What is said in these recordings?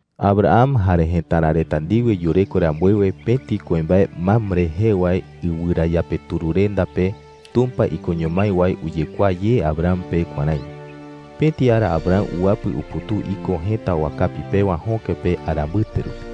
Abraham jare jëtara reta ndiwe yureko rambuewe pëti kuimbae Mamre jee wae iɨwɨrayapetururenda pe, Tumpa ikoño mái wae uyekuaa ye Abraham pe kuärái: Pëti ara Abraham uwapɨ uputuu iko jëta wakapi pewa jöke pe ara mbɨte rupi.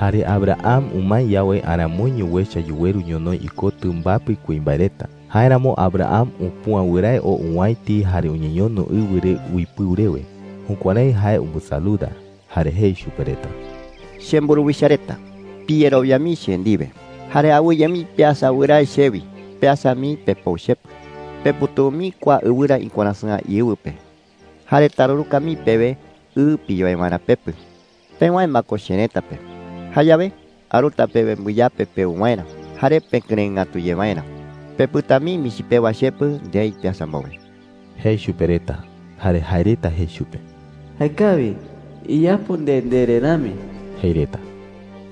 Jare Abraham umae yawe, aramoiño uecha yuweru ñonoï ikotɨ mbapɨ kuimbae reta. Jáeramo Abraham upüa wɨrae oo owäiti jare uñeñono ɨwɨ re uipɨu rewe. Jukuärái jae umbɨsaluda. Jare jei chupe reta: “Chemburuwicha reta, piyerowia mii che ndiwe jare awɨye mii peasa wɨrae chewi. Peasa mii pepou chepɨ,” jei. “Peputuu mii kua ɨwɨra iwarasɨ̈a íɨwɨ pe jare taruruka mii pewe ɨ piyoe waerä pepɨ. Pewäe ma ko cherëta pe, jayawe aruta pewe mbɨyape peu waerä jare pekɨrëɨ ngatu ye waerä. Pepɨta mii michi pewa chepɨ ndei peasa mbowe,” jei chupe reta. Jare jae reta jei chupe: “Jaekawi. Iyapo nde ndere rami,” jei reta.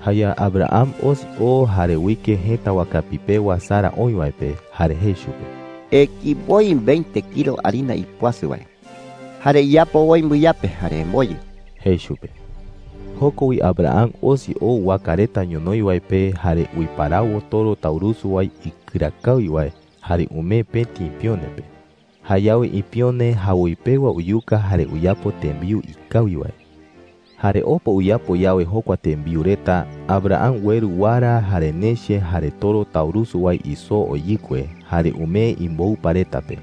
Jayawe Abraham osi oo jare uike jëta wakapi pewa Sara oï wae pe, jare jei chupe: “Eki woi veinte kilo harina ipuasɨ wae, jare iyapo woi mbɨyape jare emboyɨ,” jei chupe. Joko wi Abraham osi oo waka reta ñonoï wae pe, jare uiparawo toro taurusu wae ikɨra kawi wae, jare umee pëti ipione pe. Jayawe ipione jawoi pewa uyuka jare uyapo tembiu jëe ngatu wae. Jare opa uyapo yawe jokua tembiu reta, Abraham ueru wara jare neche jare toro taurusu wae isoo oyɨkue, jare umee imboupa reta pe.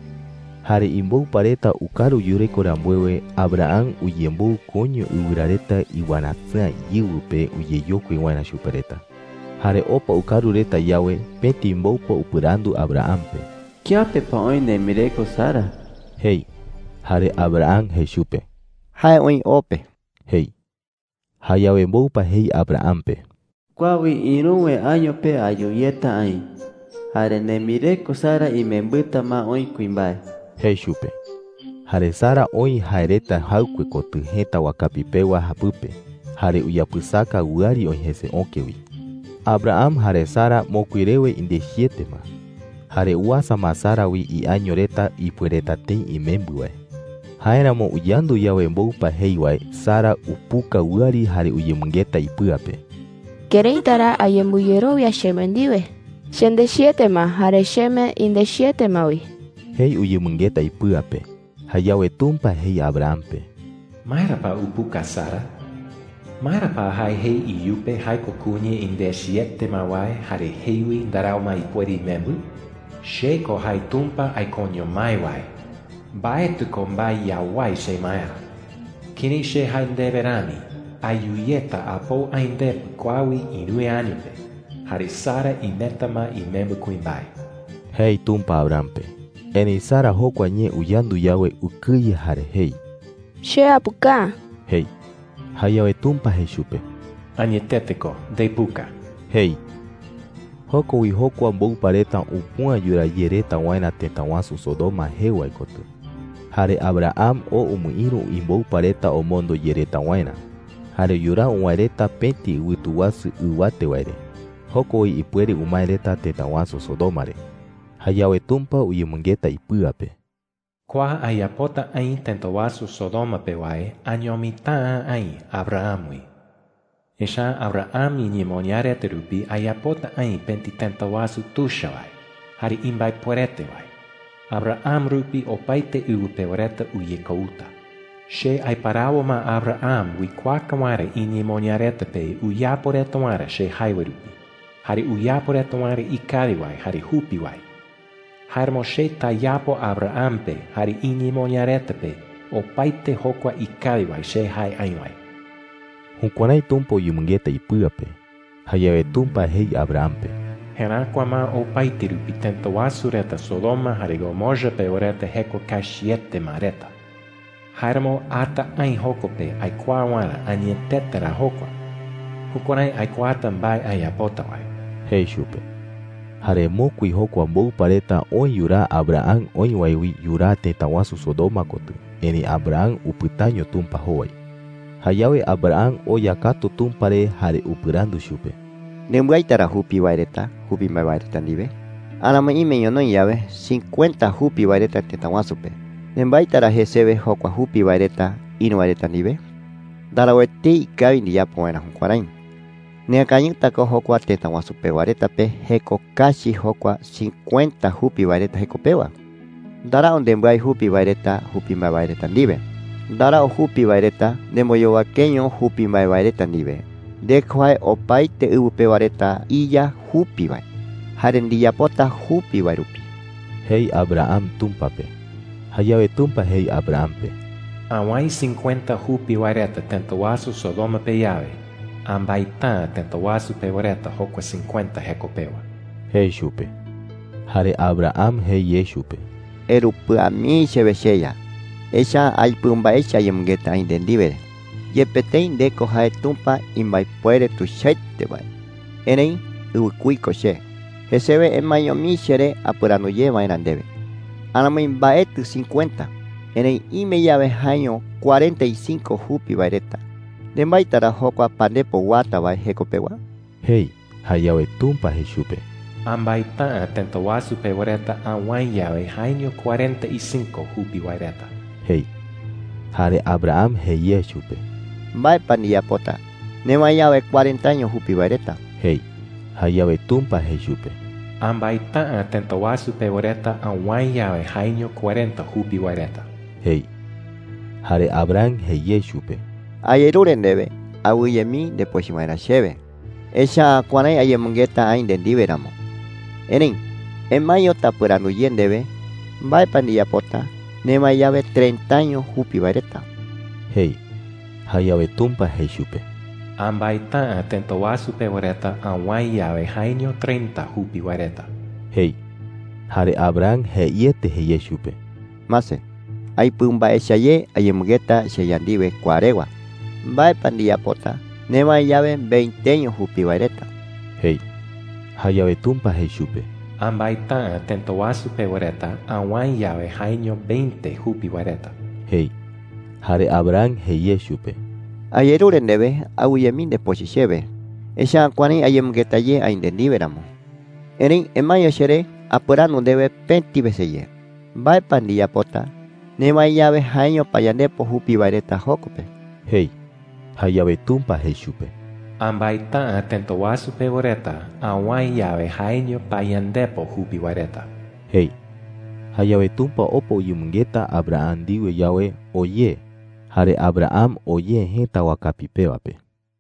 Jare imboupa reta ukaru yureko rambuewe, Abraham uyemboɨ koiño ɨwɨra reta iwarasɨ̈a íɨwɨ pe uyeyokui waerä chupe reta. Jare opa ukaru reta yawe, pëti mboupa upɨrandu Abraham pe: “¿Kiape pa oï nembireko Sara?” jei. Jare Abraham jei chupe: “Jae oï o pe,” jei. Jayawe mboupa jei Abraham pe: “Kua wi ïruwe año pe ayu yeta aï. Jare nembireko Sara imembɨta ma oï kuimbae,” jei chupe. Jare Sara oï jae reta jaɨkue kotɨ jëta wakapi pewa japɨpe, jare uyapɨsaka wɨari oï jese öke wi. Abraham jare Sara mokui rewe indechiete ma, jare uasa ma Sara wi iaño reta ipuereta tëi imembɨ wae. Jáeramo uyandu yawe mboupa jei wae, Sara upuka wɨari jare uyemɨngeta ipɨa pe: “¿Këraita ra ayembɨyerowia cheme ndiwe? Chendechiete ma jare cheme indechiete ma wi,” jei uyemɨngeta ipɨa pe. Jayawe Tumpa jei Abraham pe: “¿Maera pa upuka Sara? ¿Maera pa jae jei iyupe jae ko kuña indechiete ma wae, jare jei wi ndarau ma ipuere imembɨ?” jei. “Che ko jae Tumpa aikoño mái wae. Mbaetɨ ko mbae yawái chemaerä. Kërái che jae ndewe rami, ayu yeta apou aï ndepɨ kua wi ïruwe año pe. Jare Sara imeta ma imembɨ kuimbae,” jei Tumpa Abraham pe. Erëi Sara jokua ñee uyandu yawe, ukɨye jare jei: “Che apuka’ä,” jei. Jayawe Tumpa jei chupe: “Añetete ko, ndepuka,” jei. Joko wi jokua mboupa reta upüa yuraa ye reta waerä tëta wasu Sodoma jee wae kotɨ. Jare Abraham oo umɨïru imboupa reta omondo ye reta waerä. Jare yuraa uwäe reta pëti ɨwɨtu wasu ɨwate wae re. Joko wi ipuere umae reta tëta wasu Sodoma re. Jayawe Tumpa uyemɨngeta ipɨa pe: “Kua ayapota aï tëta wasu Sodoma pe wae añomita’ä aï Abraham wi. Echa’ä Abraham iñemoñaa reta rupi ayapota aï pëti tëta wasu tuicha wae jare imbaepuerete wae. Abraham rupi opaete ɨwɨ pewa reta uyekouta. Che aiparawo ma Abraham uikuaaka waerä iñemoñaa reta pe uyapo reta waerä che jae wae rupi, jare uyapo reta waerä ikawi wae jare jupi wae. Jáeramo che tayapo Abraham pe jare iñemoñaa reta pe opaete jokua ikawi wae che jae aï wae.” Jukuärái Tumpa uyemɨngeta ipɨa pe. Jayawe Tumpa jei Abraham pe: “Jeräkua ma opaete rupi tëta wasu reta Sodoma jare Gomorra pewa reta jeko kachiete ma reta. Jáeramo ata aï joko pe aikuaa waerä añetete ra jokua. Jukuärái aikuaata mbae ayapota wae,” jei chupe. Jare mokui jokua mboupa reta oë yuraa Abraham oï wae wi yuraa tëta wasu Sodoma kotɨ. Erëi Abraham upɨtaño Tumpa jowai. Jayawe Abraham oya katu Tumpa re jare upɨrandu chupe: “¿Nembaita ra jupi wae reta wi jupi mbae wae reta ndiwe? Aramoi ime ñonoï yawe cincuenta jupi wae reta tëta wasu pe, ¿nembaita ra jesewe jokua jupi wae reta ïru wae reta ndiwe?” jei chupe. “Ndarau etei ikawi ndiyapo waerä jukuärái. Neakañɨta ko jokua tëta wasu pewa reta pe jeko kachi jokua cincuenta jupi wae reta jeko pewa. Ndarau nembái jupi wae reta jupi mbae wae reta ndiwe. Ndarau jupi wae reta nemboyowakeño jupi mbae wae reta ndiwe. Nde ko jae opaete ɨwɨ pewa reta iYa jupi wae, jare ndiyapota jupi wae rupi,” jei Abraham Tumpa pe. Jayawe Tumpa jei Abraham pe: “Awäe cincuenta jupi wae reta tëta wasu Sodoma pe yawe, ambaita’ä tëta wasu pewa reta jokua cincuenta jeko pewa,” jei chupe. Jare Abraham jei ye chupe: “Erupɨa mii chewe, cheYa, echa’ä aipɨu mbae echa ayemɨngeta aï nde ndiwe,” jei. “Yepe tëi nde ko jae Tumpa imbaepuere tuichaete wae, erëi ɨwɨkuí ko che, jesewe emaeño mii cheré apɨrandu ye waerä ndewe,” jei. “Aramoi mbaetɨ cincuenta, erëi ime yawe jaeño cuarenta y cinco jupi wae reta, ¿nembaita ra jokua pandepo uata wae jeko pewa?” jei. Jayawe Tumpa jei chupe: “Ambaita’ä tëta wasu pewa reta awäe yawe jaeño cuarenta y cinco jupi wae reta,” jei. Jare Abraham jei ye chupe: “¿Mbae pa ndiyapota newäe yawe cuarentaño jupi wae reta?” jei. Jayawe Tumpa jei chupe: “Ambaita’ä tëta wasu pewa reta awäe yawe jaeño cuarenta jupi wae reta,” jei. Jare Abraham jei ye chupe: “Ayerure ndewe awɨye mii ndepochɨ waerä chewe, echa’ä kuärái ayemɨngeta aï nde ndiwe ramo. Erëi emaeño tapɨrandu ye ndewe, ¿mbae pa ndiyapota newäe yawe treintaño jupi wae reta?” jei. Jayawe Tumpa jei chupe: “Ambaita’ä tëta wasu pewa reta awäe yawe jaeño treinta jupi wae reta,” jei. Jare Abraham jeiete jei ye chupe: “Mase, aipɨu mbae echa ye ayemɨngeta cheYa ndiwe kua rewa,” jei. “¿Mbae pa ndiyapota newäe yawe veinteño jupi wae reta?” jei. Jayawe Tumpa jei chupe: “Ambaita’ä tëta wasu pewa reta awäe yawe jaeño veinte jupi wae reta,” jei. Jare Abraham jei ye chupe: “Ayerure ndewe awɨye mii ndepochɨ chewe, echa’ä kuärái ayemɨngeta ye aï nde ndiwe ramo,” jei. “Erëi emaeño cheré apɨrandu ndewe pëti wese ye, ¿mbae pa ndiyapota newäe yawe jaeño payandepo jupi wae reta joko pe?” jei. Jayawe Tumpa jei chupe: “Ambaita’ä tëta wasu pewa reta awäe yawe jaeño payandepo jupi wae reta,” jei. Jayawe Tumpa opa uyemɨngeta Abraham ndiwe yawe, oo ye. Jare Abraham oo ye jëta wakapi pewa pe.